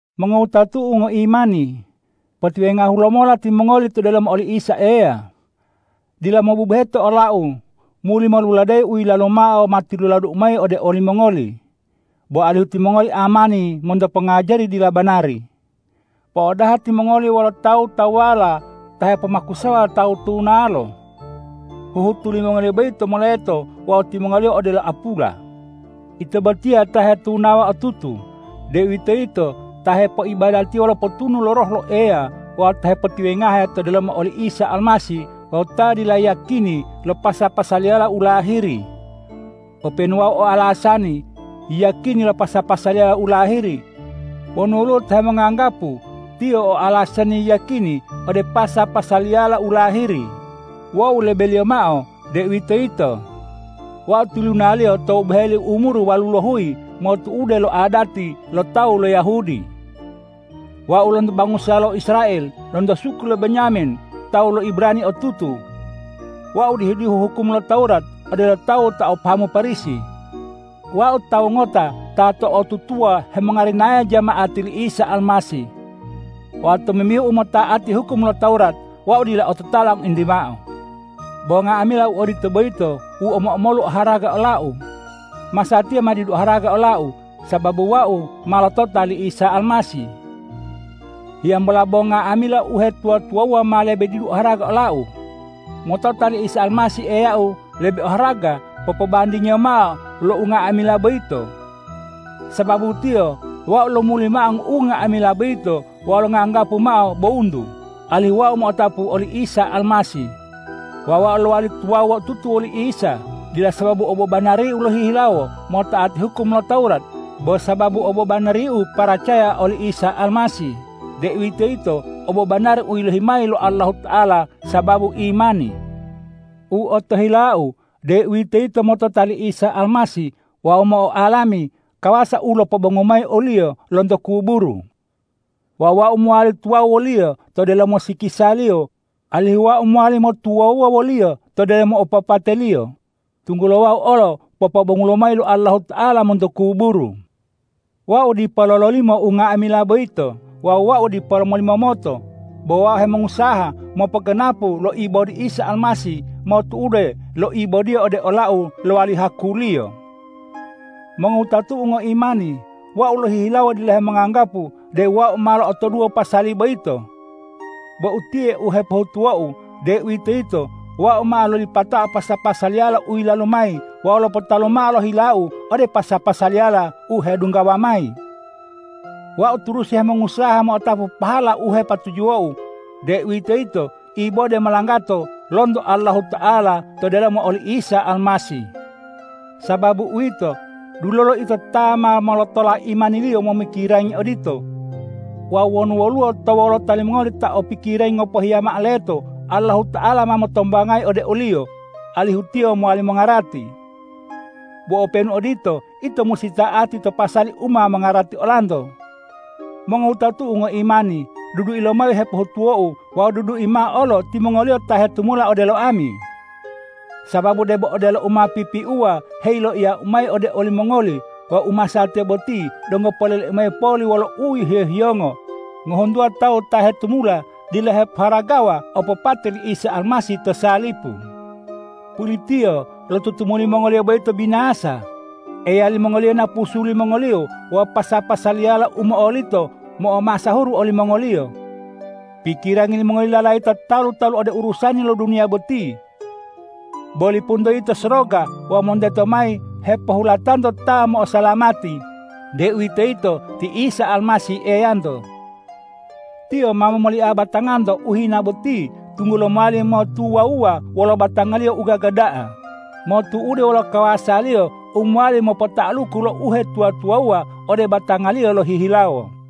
Mongowutatu'u ngoimani, potiwengahu lomola timongoli to delomo oli Isa Eya. Dila mobubuheto olau muli moluladeyi u yilalu mao ma tiluladu'u mayi ode olimongoli, bo alihu timongoli amani monto pongajari dila banari. Po'odaha timongoli wolo tawu-tawuwala ta hepomakusawa tawu tunalo. Huhutu limongoliyo boyito moleto wawu timongoliyo odelo apula. Ito botiya ta hetunawa otutu, deuwitoyito ta hepoibadatiya wolo potunu lo Roh lo Eya wawu ta hepotiwengahe to delomo oli Isa Almasih wawu ta dila yiyakini lo pasa-pasaliyala u lahiri, openu wau o alasani yiyakini lo pasa-pasaliyala u lahiri. Wonu woluwo ta hemonganggapu tiyo o alasani yiyakini ode pasa-pasaliyala u lahiri, wau lebeliyo mao, deuwitoyito: Wau tilunaliyo tou boheli umuru walulohuyi motu'ude lo adati lo tawu lo Yahudi. Wau lonto bangusa lo Israel, lonto suku lo Benyamin, tawu lo Ibrani otutu. Wau dihu-dihu hukum lo Tawurat odelo tawu ta o pahamu Parisi. Wau tawu ngota ta to'otutuwa hemongarinaya jama'ati li Isa Almasih. Wawu tomimbihu umota'ati hukum lo Tawurat, wau dila ototala ngointi mao. Bo nga'amila u odito boyito u omo-omolu oharaga olau, masatiya ma didu oharaga olau, sababu wau ma lotota li Isa Almasih. Hiyambola bo nga'amila uhetuwa-tuwawuwa ma lebe didu oharaga olau. Motota li Isa Almasih Eyau lebe oharaga popobandingiyo mao lo unga'amila boyito. Sababu Tiyo wau lomuli mao unga'amila boyito wawu longanggapu mao bowuntu, alihu wau mo'otapu oli Isa Almasih wawu wau lowali tuwawu otutu woli Isa, dila sababu obobanariu lohihilawo mota'ati hukum lo Tawurat, bo sababu obobanariu paracaya oli Isa Almasih, deuwitoyito obobanari u yilohi mayi lo Allahuta'ala sababu imani. U otohilau, deuwitoyito motota li Isa Almasih wawu mo'oalami kawasa u lopobongu mayi o-Liyo lonto kuburu. Wawu wau mowali tuwawu wo-Liyo to delomo sikisa-Liyo, alihu wau mowali motuwawuwa wo-Liyo to delomo opopate-Liyo, tunggulo wau olo popobongulo mayi lo Allahuta'ala monto kuburu. Wau dipo lololimo unga'amila boyito wawu wau dipo molimomoto, bo wau hemongusaha mopoganapu lo ibodi Isa Almasih motu'ude lo ibod-Iyo ode olau lowali haku-Liyo. Mongowutatu'u ngoimani, wau lohihilawo dila hemonganggapu deu wau ma lo'otoduwo pasali boyito. Bo utiye u hepohutuwou, deuwitoyito wau ma lolipatao pasa-pasaliyala u yilalu mayi wawu lopotalu mao lo hilau ode pasa-pasaliyala u hedunggawa mayi. Wau turusi hemongusaha mo'otapu pahala u hepatujuwou, deuwitoyito ibode molanggato lonto Allahuta'ala to delomo oli Isa Almasih. Sababu uwito, dulolo ito ta ma molotola imaniliyo momikirangi odito. Wawu wonu woluwo to wolota limongoli ta o pikirangi ngopohiya mao leto, Allahuta'ala ma motombangayi ode oliyo, alihu tiyo mowali mongarati. Bo openu odito, ito musi ta'ati to pasali u ma mongarati olanto. Mongowutatu'u ngoimani, dudui lomayi u hepohutuwou wawu dudui mao olo timongoliyo ta hetumula odelo ami. Sababu debo odelo u ma pipiuwa heyiloiyau mayi ode olimongoli wawu u masatiya boti donggo poleleu mayi poli wolo uhiyo-hiyongo, ngohuntuwa tawu ta hetumula dila hepoharagawa opopate li Isa Almasih to salipu. Pulitiyo lo tutumuli mongoliyo boyito binasa, eya limongoliyo napusu limongoliyo wawu pasa-pasaliyala u mo'olito, mo'omasahuru olimongoliyo. Pikirangi limongoliyo lalayita talu-talu ode urusani lo duniya boti. Bo lipunto yito soroga wawu monteto mayi hepohulatanto Ta mo'osalamati, deuwitoyito ti Isa Almasih Eyanto. Tiyo ma momolia batanganto u hina boti tunggulo mowali motuwawuwa wolo batanga-Liyo u gaga da'a, motu'ude wolo kawasa-Liyo u mowali mopota'aluku lo uhetuwa-tuwawuwa ode batanga-Liyo lohihilawo.